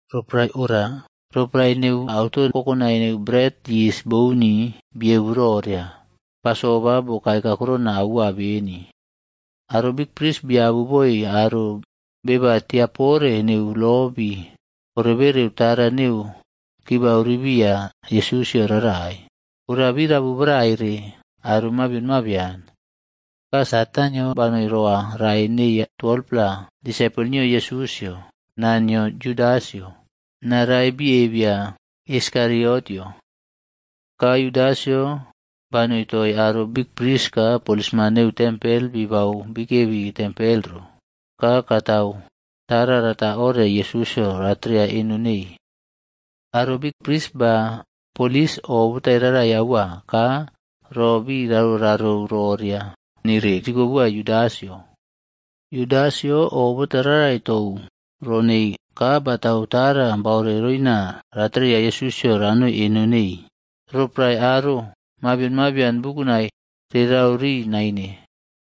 Roporae ora, roporae neu Auto Kokonai neu Bret Yis Bounia biebu roria Pasova bokae kakurona aua beni. Aro bikpris biabuboi aro beba tiapore neu lo bii orebereu tara neu kibau ribiya Yesusꞌyo rarai, ora bii rabu baraeꞌre aro mabion mabian. Ka Satanꞌyo banoi roa rae nei 12-pla disaipol nio Yesusꞌyo. Naa nio Yudasꞌyo, naa rae biebiya Iskariotꞌyo. Ka Yudasꞌyo banoi toii aro bikpris ka polisman neu tempel bibau bikebi tempel ro ka katau tara rata ore Yesusꞌyo ratereya eno nei. Aro bikpris ba polis oꞌbotairarai aua ka ro biraroꞌrarou roria nire rikoboa Yudasꞌyo. Yudasꞌyo oꞌbotararai tou ro neii ka batau tara baore roina ratereya Yesusꞌyo ranoi eno neii, roporae aro mabion manbian bukunai rerau rii naine.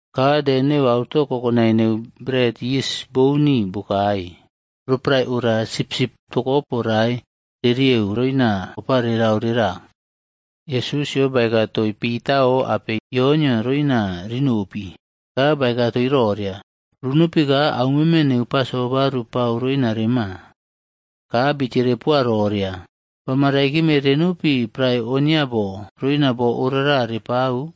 Ka De neu Auto kokonai neu Bret Yis Bouni bokae. Roporae ora sipsip tokopo rae rerieu roina ofa rerau rera. Yesusꞌyo baeka toii Pitaꞌo apei Yonꞌyo roina rinopi, ka baeka toii roria, “Runopi ka aumeme neu Pasova rupau roina rema.” Ka bitiere poa roria, “Bama raikime renopi prae oniabo roina bo orara repau?”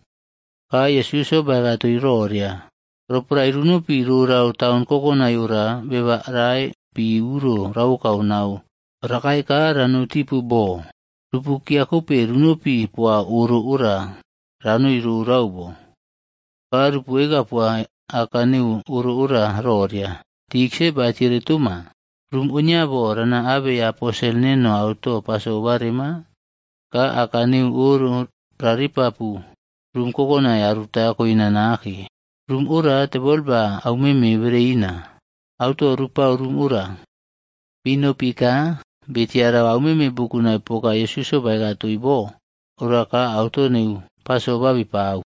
Yesusꞌyo baeka toii roria, “Roporae runopi rorau taun kokonai ora, beba rae pi uro raokau nau rakae ka ranou tipu bo. Rupu kiyakope runopi poa oro ora ranoi rorau bo. “Ka rupu eka poa aka neu oro ora roria, ‘Tiksa batiere toma, “Rum onebo rana abei disaipol neno auto Pasova rema?” ’ Ka aka neu oro raripapu rum kokonai aruta boina nake. Rum ora tebol ba aumeme bereina. Auto rupau rum ora.” Binopi ka bitiarau aumeme bukunai poka Yesusꞌyo baeka toii bo. Ora ka auto neu Pasova bipau.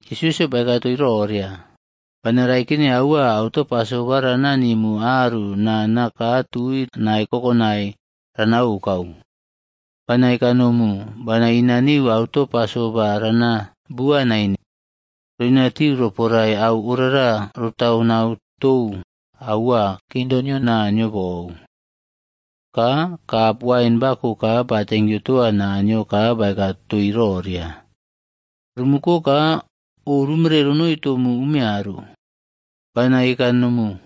Yesusꞌyo baeka toii roria, “Bana raikin aua auto Pasova rana nimu aru nana ka tui nae kokonai rana okau. Bana eka nomu, bana inaniu auto Pasova rana bua nain b roinatiu roporae au orara roꞌtaunau tou aua kingdom nio Naniyo bou.” Ka kap wain bako ka ba tenkyu toa Naniyo ka baeka toii roria, “Rumu ko ka orumere ronoi tomu umiaru. Bana eka nomu,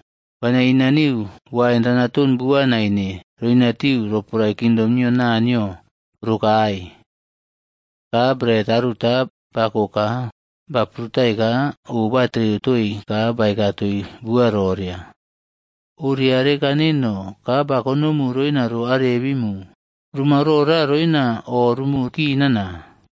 bana inaniu wain ranaton bua naine roina tiu roporae kingdom nio Naniyo rokae.” Ka bret aruta bako ka ba putari ka oꞌbatere toii ka baeka toii bua roria, “Oria reka neno ka ba konomu roina ro arebimu. Rumau rora roina o rumu kinaꞌna.”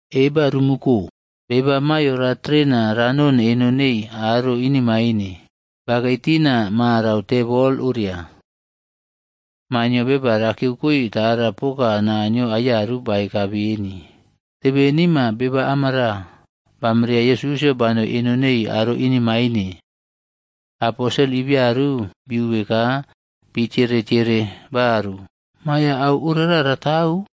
Eba rumuko, Beba maiyo ratrena ranon eno neii aro inemaine, bakei tina marau tebol oria. Maa nio Beba rakiyeu koe tara poka Naniyo aiyaru baeka beni. Tebenima beba amaꞌra bamereya Yesusꞌyo bonoi eno nei aro inemaine.” Aposel ibiaru biuwe ka bii tiereꞌtiere baru, “Maiyo au orara ratau?”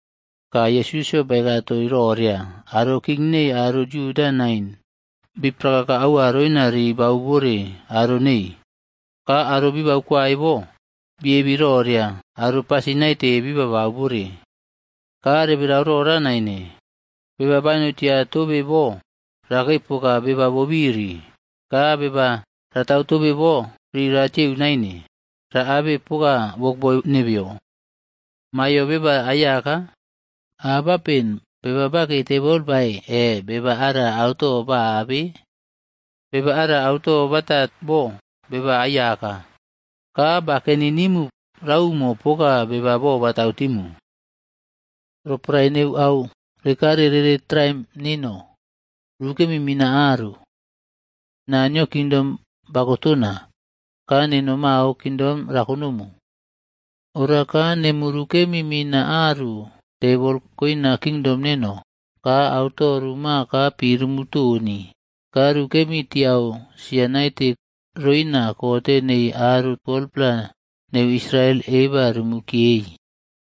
Ka Yesusꞌyo baeka toii roria, “Aro king neii aro Yuda nain, bii prakaka aua roina rii bau bore aro nei. Ka aro bibau kuwai bo, biebii roria, aro pasin naite bibabau bore. Ka rebe rau rora naine. Beba banoi tia tobe bo rakei poka beba bobiri. Ka beba ratautobe bo riꞌratieu naine, raꞌabe poka wokboi nebeyo. Maiyo beba aiyaka? Abapen beba bakei tebol bae e, beba ara auto ba abe?d Beba ara auto bata bo beba aiyaka. Ka bakeni nimu roumo poka beba bo batau timu. Roporae neu au rekare rere traim nino, rukemi mina aru. Naniyo kingdom bakotona, ka neno mao kingdom rakonomu. Ora ka nemu rukemi mina aru tebol koina kingdom neno, ka auto ruma ka pirumu toni. Ka rukemi tiau sia naite roina kote neii aro 12-pla neu Israel eba rumu kiyei.”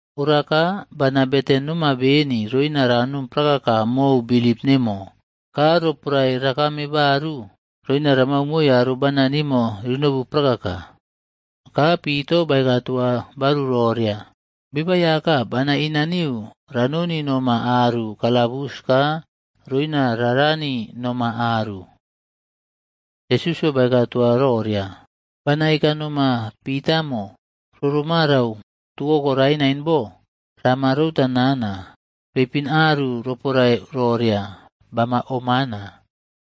Ora ka bana beten noma beni roina ranom prakaka mou bilip nemo. Ka roporae rakame baru, roina ramau moi aro bana nimo rinobu prakaka.” Ka Pitaꞌo baeka toa baru roria, “Beba Aiyaka, bana inaniu ranoni noma aru kalabus ka roina rarani noma aru.” Yesusꞌyo baeka toa roria, “Bana eka noma Pitaꞌmo, roro marau tukoko rae nain bo, rama routaꞌnana peipinꞌaru roporae roria bama omꞌmana.”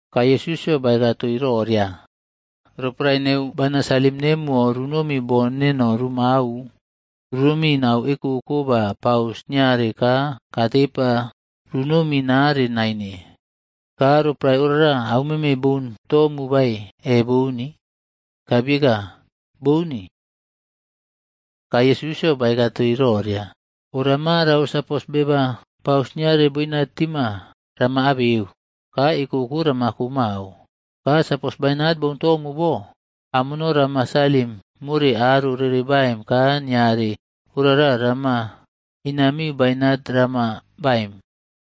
Ka Yesusꞌyo baeka toii roria, “Roporae neu bana salim nemuwo runomi boo neno rumau, runomi nau ekoko ba paus niare ka katepa runomi nare naine. Ka roporae orara aumeme boun tomu bae, e bouni?” Ka bieka, “Bouni.” Ka Yesusꞌyo baeka toii roria, “Ora marau sapos beba paus niare boinatima rama abeu. Ka ekoko rama ko mao. Ka sapos bainat boun tomu bo, amono rama salim more aro rere baim ka niare orara rama inamiu bainat rama baim.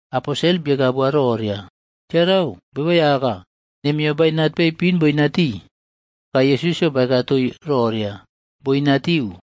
Aposel bieka boa roria, “Tiarau, Beba Aiyaka, nemeiyo bainat peipin boinatii.” Ka Yesusꞌyo baeka toii roria, “Boinatiu.”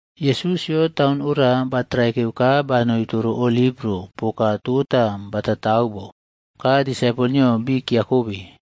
Yesusꞌyo taun ora batraikeu ka banoi toro Oliv ro poka tota bataꞌtau bo, ka disaipol nio bii kiyakobe.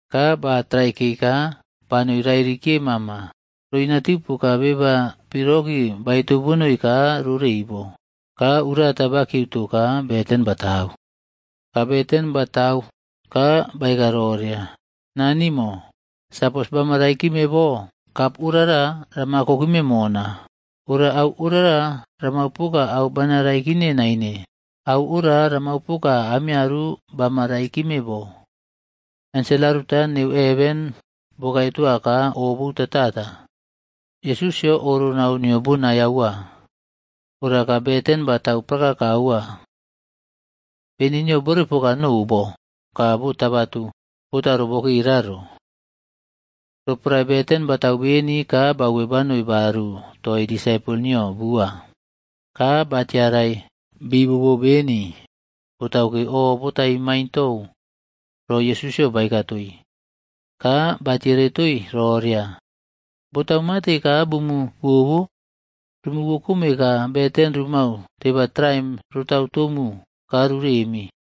Ka ba traikei ka banoi rairi kiye mama, roinatiu poka beba piroki baeto bonoi ka rorei bo. Ka urata bakiyeuto ka beten batau. Ka beten batau ka baeka roria, “Naniꞌmo, sapos bama raikime bo, kapf orara rama kokime mona. Ora au orara ramau poka au bana raikine naine, au ora ramau poka amiaru bama raikime bo.” Ensel aruta neu heven bokae toa ka o boutataꞌta. Yesusꞌyo o rorau nio bonae aua, ora ka beten batau prakaka aua. Bene nio bore poka noo bo ka bo tabatu botaro bokera ro. Roporae beten batau beni ka bauwe banoi baru toii disaipol nio bua. Ka ba tiarai bi bobo beni botauke o botai main tou ro Yesusꞌyo baeka toii. Ka batiere toi roria, “Botau mate ka bumu bobo? Rumu wokome ka beten rumau teba traim rotau tomu, ka ruremi.”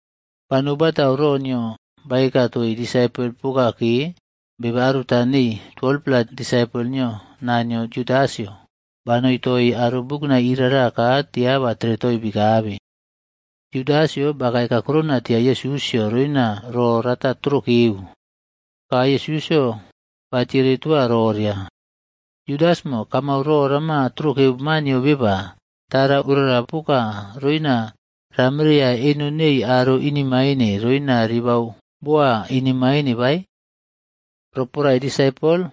Banou batau ro nio baeka toii disaipol poka ke, beba aruta nei 12-pla disaipol nio naa nio Judasꞌyo. Banoi toii aro bukunai irara ka tia batere toii bikobe. Judasꞌyo bakae kakurona tia Yesusꞌyo roina ro rata torokeu. Ka Yesusꞌyo batiere toa roria, “Judasꞌmo, kamau ro rama trokeu Maa nio Beba tara orara poka roina ramereya eno nei aro inemaine roina ribau boa inemaine bae?” Roporae disaipol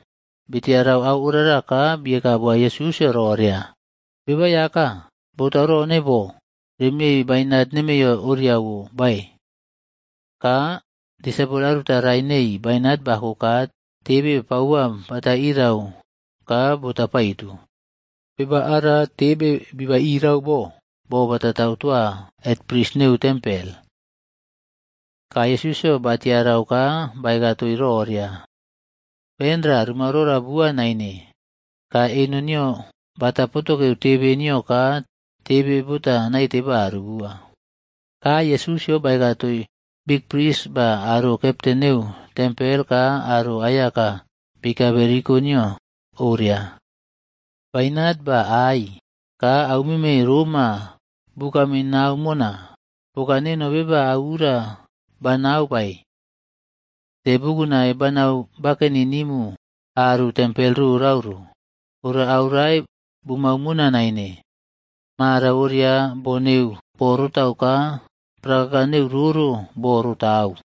bitiarau au orara ka bieka boa Yesusꞌyo roria, “Beba Aiyaka, botau rone bo, remiei bainat nemeiyo orewo bae?” Ka disapol aruta rae neii bainat bako ka tebe paua bata irau ka bopaitu. Beba ara tebe biba irau bo, bo bataꞌtau toa hetpris neu tempel. Ka Yesusꞌyo batiarau ka baeka toii roria, “Benra! Rumau rora bua naine.” Ka eno nio bata potokeu tebe nio ka tebe bota naite baru bua. Ka Yesusꞌyo baeka toii bikpris ba aro kepten neu tempel ka aro aiyaka bikabe riko nio oria, “Bainat ba ai, ka aumeme rooma bukame nau mona, poka neno beba auꞌura banau bae? De bukunai banau bakeni nimu aru tempel rorau ro, ora au rae bumau mona naine. Marau oria bo neu boo rotau ka prakaka neu roro boo rotau.”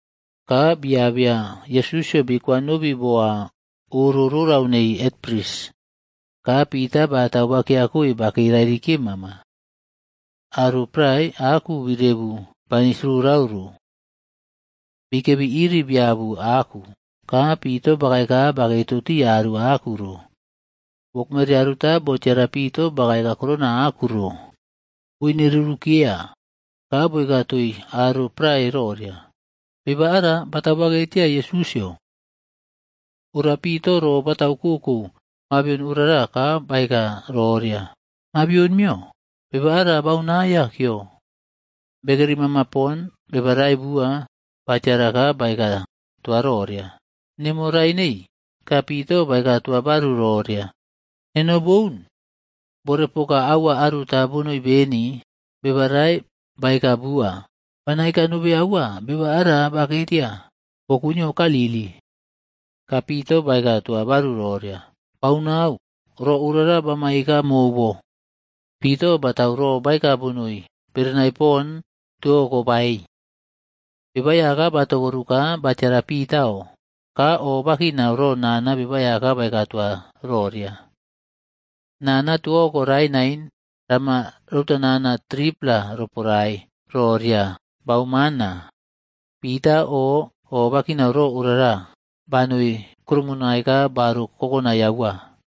Ka biabeya Yesusꞌyo bi kwanobi boa oro rorau nei hetpris. Ka Pitaꞌo batau bakikiya koe bakei rairi kiye mama. Aro prae aku bi rebu banis rorau ro, bikebi iri biabu aku, ka Pitaꞌo bakae bakeito tii aru aku ro. Wokmeri aruta bo tiara Pitaꞌo bakei kakurona aku ro. Boineꞌrurukeya ka boeka toii aro prae roria, “Beba ara batau bakei tia Yesusꞌyo.” Ora Pitaꞌo ro batau kokou mabion orara ka baeka roria, “Mabionꞌmio, beba ara baunaiya kiyo.” Bekeri mama pon, beba rae bua batiara ka baeka toa roria, “Nemo rae neii.” Ka Pitaꞌo baeka toa baru roria, “Neno boun.” Bore poka hauwa aruta bonoi beni, beba rae baeka bua, “Bana eka nobe aua roria, beba ara bakei tia. Bo ku nio Galili.” Ka Pitaꞌo baeka toa baru roria, “Baonau ro orara bama eka mou bo.” Pitaꞌo batau ro baeka bonoi, berenai pon tukoko baei. Beba Aiyaka ba toboru ka ba tiara Pitaꞌo, ka oꞌbakinau ro nana Beba Aiyaka baeka toa roria, “Nana tukoko raꞌeii nain, rama routanana 3-pla roporae roria baomana.” Pitaꞌo o bakinau ro orara, banoi krumonai ka baro kokonai aua.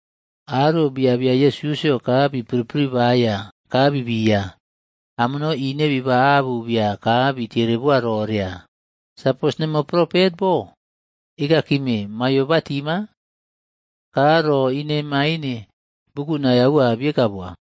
Aro biabeya Yesusꞌyo ka biꞌpiripiri baiya ka bibia. Amono ine biba abu bia ka bitiere boa roria, “Sapos nemo propet bo, ekakime, maiyo batima?” Ka ro inemaine bukunai aua bieka boa.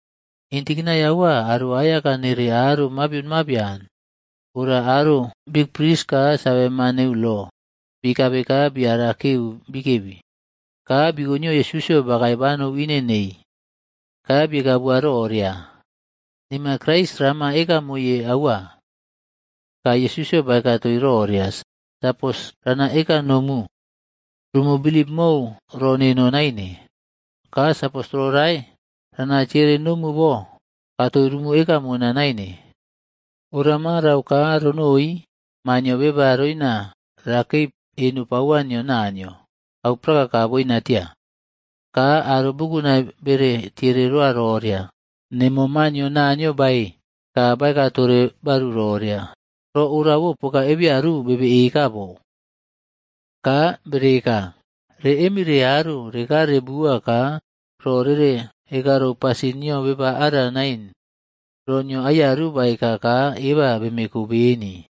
Intikinai aua, aro aiyaka nere aro mabian mabion, ora aro bikpris ka saveman neu lo, bikabe ka biarakeu bikebi. Ka biko nio Yesusꞌyo bakae banou ine nei. Ka bieka boa roria, “Nimo Krais rama eka moiye aua.” Ka Yesusꞌyo baeka toii roria, “Sapos rana eka nomu, rumu bilip mou ro neno naine. Ka sapos ro rae rana tiere nomu bo, katoi rumu eka mona naine. Ora marau ka ronoi, Maa nio Beba roina rakei eno paua nio Naniyo, au prakaka boina tia.” Ka aro bukunai bere tiere roa roria, “Nemo Ma nio Naniyo bae?” Ka baeka tore baru roria, “Ro orawo poka ebeyaru bebe eka bo.” Ka bere eka, “Reꞌemire aro rekare bua ka ro rere ekarou pasin nio beba ara nain. Ro nio aiyaru baeka ka eba beko beni.”